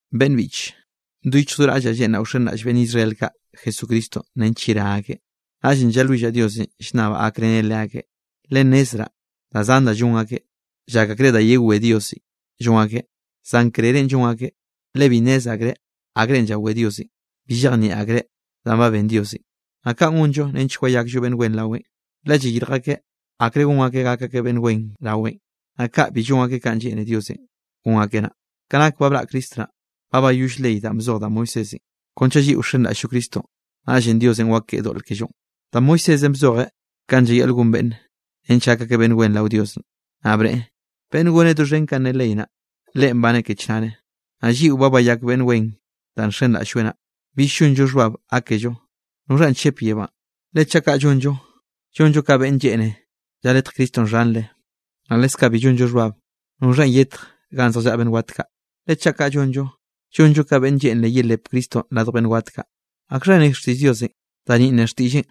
Beꞌnn biꞌche, do yichj do raꞌllaꞌ lleꞌnraꞌ wxenraꞌll beꞌnn Israel kaꞌ Jesucristonꞌ nench yerá akeꞌ, naꞌllenꞌ llalwillaꞌ Diosenꞌ, llnnabaꞌ gakreneꞌ leakeꞌ. Le nnezraꞌ da zan da llon akeꞌ, llak akreꞌ da yewé Diosenꞌ llon akeꞌ, zan krerenꞌ llon akeꞌn, le bi nnez akreꞌ akrenꞌ llawé Diosenꞌ. Bi llejnieꞌ akreꞌ danꞌ ba ben Diosenꞌ, naꞌ kanꞌ gonllo nench wayakllo beꞌnn wen raweꞌn, le llayirj akeꞌ akre gon akeꞌ gak akeꞌ beꞌnn wen raweꞌn, naꞌ kaꞌ bi llon akeꞌ kanꞌ lleꞌne Diosenꞌ gon akeꞌ naꞌ. Ka nak ba braꞌ Cristo naꞌ, ba bayoll ley danꞌ bzoj da Moisésenꞌ, kon chaꞌ lliꞌo wxenraꞌll-llo Cristonꞌ, naꞌllenꞌ Diosenꞌ wakeꞌe doꞌl kellonꞌ. Da Moisésenꞌ bzojeꞌ kanꞌ llayaꞌl gon beꞌnne, nench gak akeꞌ beꞌnn wen rao Dios, naꞌ bneꞌe: “Beꞌnne goneꞌ doxhen kanꞌ ne ley naꞌ, leꞌen baneꞌ ke chnare.” Naꞌ lliꞌo ba bayak beꞌnn wen danꞌ nxenraꞌll-lloeꞌ naꞌ, bill llonllo xhbab gákello: “¿Noxhanꞌ chep yebánꞌ?” Le chaꞌ kaꞌ llonllo, llonllo ka beꞌnn lleꞌne lljaletjeꞌ Cristonꞌ xhanre. Naꞌ leskaꞌ bi llonllo xhbab: “¿Noxhanꞌ yetj ganꞌ zjallaꞌa beꞌnn wat kaꞌ?” Le chaꞌ kaꞌ llonllo, llonllo ka beꞌnn lleꞌnre yelepeꞌ Cristonꞌ radj beꞌnn wat kaꞌ. ¿Akxha ne xtiꞌll Diosenꞌ? Da ninꞌ ne xtiꞌlleꞌn: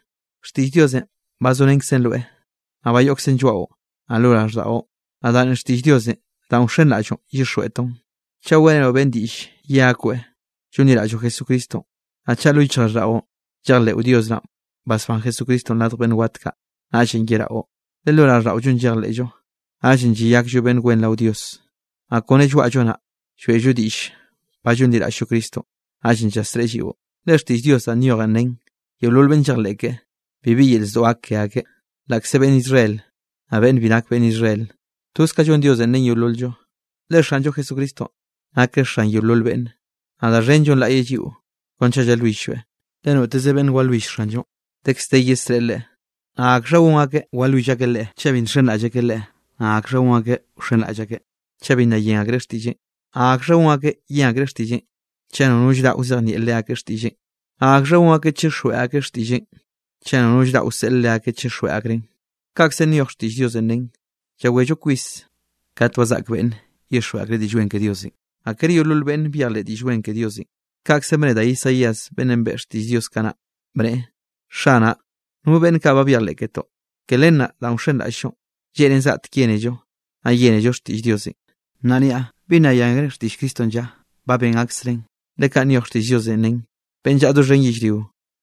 “Xtiꞌll Diosenꞌ ba zorenkzen rweꞌ, naꞌ ba yoꞌkzen lloaꞌo, naꞌ lo raꞌlldaꞌo.” Naꞌ da ninꞌ xtiꞌll Diosenꞌ danꞌ wxenraꞌll-llonꞌ llyixjweꞌtoꞌn. Chaꞌ weꞌrenoꞌ beꞌnne diꞌll ye akoeꞌ llonliraꞌlloꞌ Jesucristonꞌ, naꞌ chaꞌ do lo yichjraꞌlldaꞌo llejleꞌo Dios naꞌn basbán Jesucristonꞌ radj beꞌnn wat kaꞌ, naꞌllenꞌ yeraꞌo. Le lo raꞌlldaꞌollonꞌ llejleꞌllo, naꞌllenꞌ llayakllo beꞌnn wen rao Dios, naꞌ kone lloaꞌllo naꞌ, lloeꞌllo diꞌll ba llonliraꞌll-llo Cristonꞌ, naꞌllenꞌ llasreꞌe lliꞌo. Le xtiꞌll Dios danꞌ nyojen nen: “Yeolol beꞌnn llejleꞌ keꞌe, bibi yel zdoꞌ gak ke akeꞌ.” Laꞌkze beꞌnn Israel, naꞌ beꞌnn bi nak beꞌnn Israel, toz ka llon Diosenꞌ ren yeolol-llo. Le Xanllo Jesucristonꞌ nakeꞌ Xan yeolol beꞌnne, naꞌ da xhen llonlaꞌyeꞌ lliꞌo kon chaꞌ walwill-lloeꞌ. Le noteze beꞌnne walwill Xanllonꞌ, dekz de yesreꞌe leꞌe. ¿Naꞌ akxha gon akeꞌ walwill akeꞌ Leꞌe, chaꞌ bi nxenraꞌll akeꞌ Leꞌe? ¿Naꞌ akxha gon akeꞌ wxenraꞌll akeꞌ, chaꞌ bi nna yen akreꞌ xtiꞌlleꞌn? ¿Naꞌ akxha gon akeꞌ yen akreꞌ xtiꞌlleꞌn, chaꞌ nono llraꞌ wzejnieꞌ leakeꞌ xtiꞌlleꞌn? Naꞌ ¿akxha gon akeꞌ chixjweꞌ akreꞌ xtiꞌlleꞌn, chaꞌ nono llraꞌ wseꞌl leakeꞌ chixjweꞌ akreꞌn? Kaꞌkzenꞌ nyoj xtiꞌll Diosenꞌ nen: “Llawello kwis kat ba zaꞌk beꞌnne llyixjweꞌ akreꞌ Diꞌll Wen ke Diosenꞌ.” Naꞌ kere yeolol beꞌnne byejleꞌ Diꞌll Wen ke Diosenꞌ, kaꞌkzenꞌ bne da Isaías beꞌnnenꞌ beꞌe xtiꞌll Diosenꞌ kanaꞌ, bneꞌe: “Xanaꞌ, ¿no beꞌnn kaꞌ ba byejleꞌ ketoꞌ?” Ke len naꞌ danꞌ wxenraꞌll-llonꞌ, lleꞌnen zgaꞌtek yénello, naꞌ yénello xtiꞌll Diosenꞌ. Naꞌ niaꞌ: ¿Bi nna yen akreꞌ xtiꞌll Cristonꞌ lla? Ba ben aksreꞌn, le kanꞌ nyoj xtiꞌll Diosenꞌ, nen: Beꞌnn llaꞌa doxhen yellrio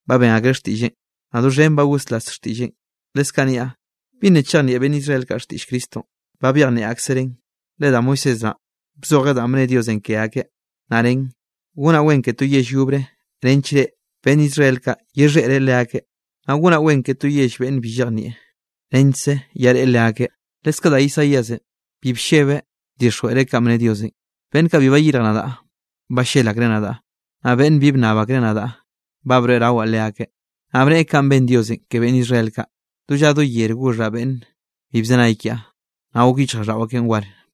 ba ben akreꞌ xtiꞌlleꞌn; naꞌ doxhen ba goslas xtiꞌlleꞌn. Leskaꞌ niaꞌ: ¿Bi nna chejnieꞌ beꞌnn Israel kaꞌ xtiꞌll Cristonꞌ? Ba byejnieꞌ aksereꞌn, le da Moisés naꞌ, bzojeꞌ danꞌ bne Diosenꞌ ke akeꞌ, naꞌ nen: Gonaꞌ wen ke to yell yobre nench reꞌ, beꞌnn Israel kaꞌ, yexheꞌre leakeꞌ. Naꞌ gonaꞌ wen ke to yell beꞌnn bi llejnieꞌ, nechkze llaꞌre leakeꞌ. Leskaꞌ da Isaíasenꞌ bi bllebeꞌ bdixjweꞌreꞌ kanꞌ bne Diosenꞌ: Beꞌnn kaꞌ bi bayirj nadaꞌ, ballel akreꞌ nadaꞌ. Naꞌ beꞌnn bi bnnab akreꞌ nadaꞌ, ba broeꞌrawaꞌ leakeꞌ. Naꞌ bneꞌe kanꞌ ben Diosenꞌ ke beꞌnn Israel kaꞌ: “Do lla do yere goxhaꞌ beꞌnn bi bzenay kiaꞌ, naꞌ gok yichjraꞌlldaꞌo akeꞌn war.”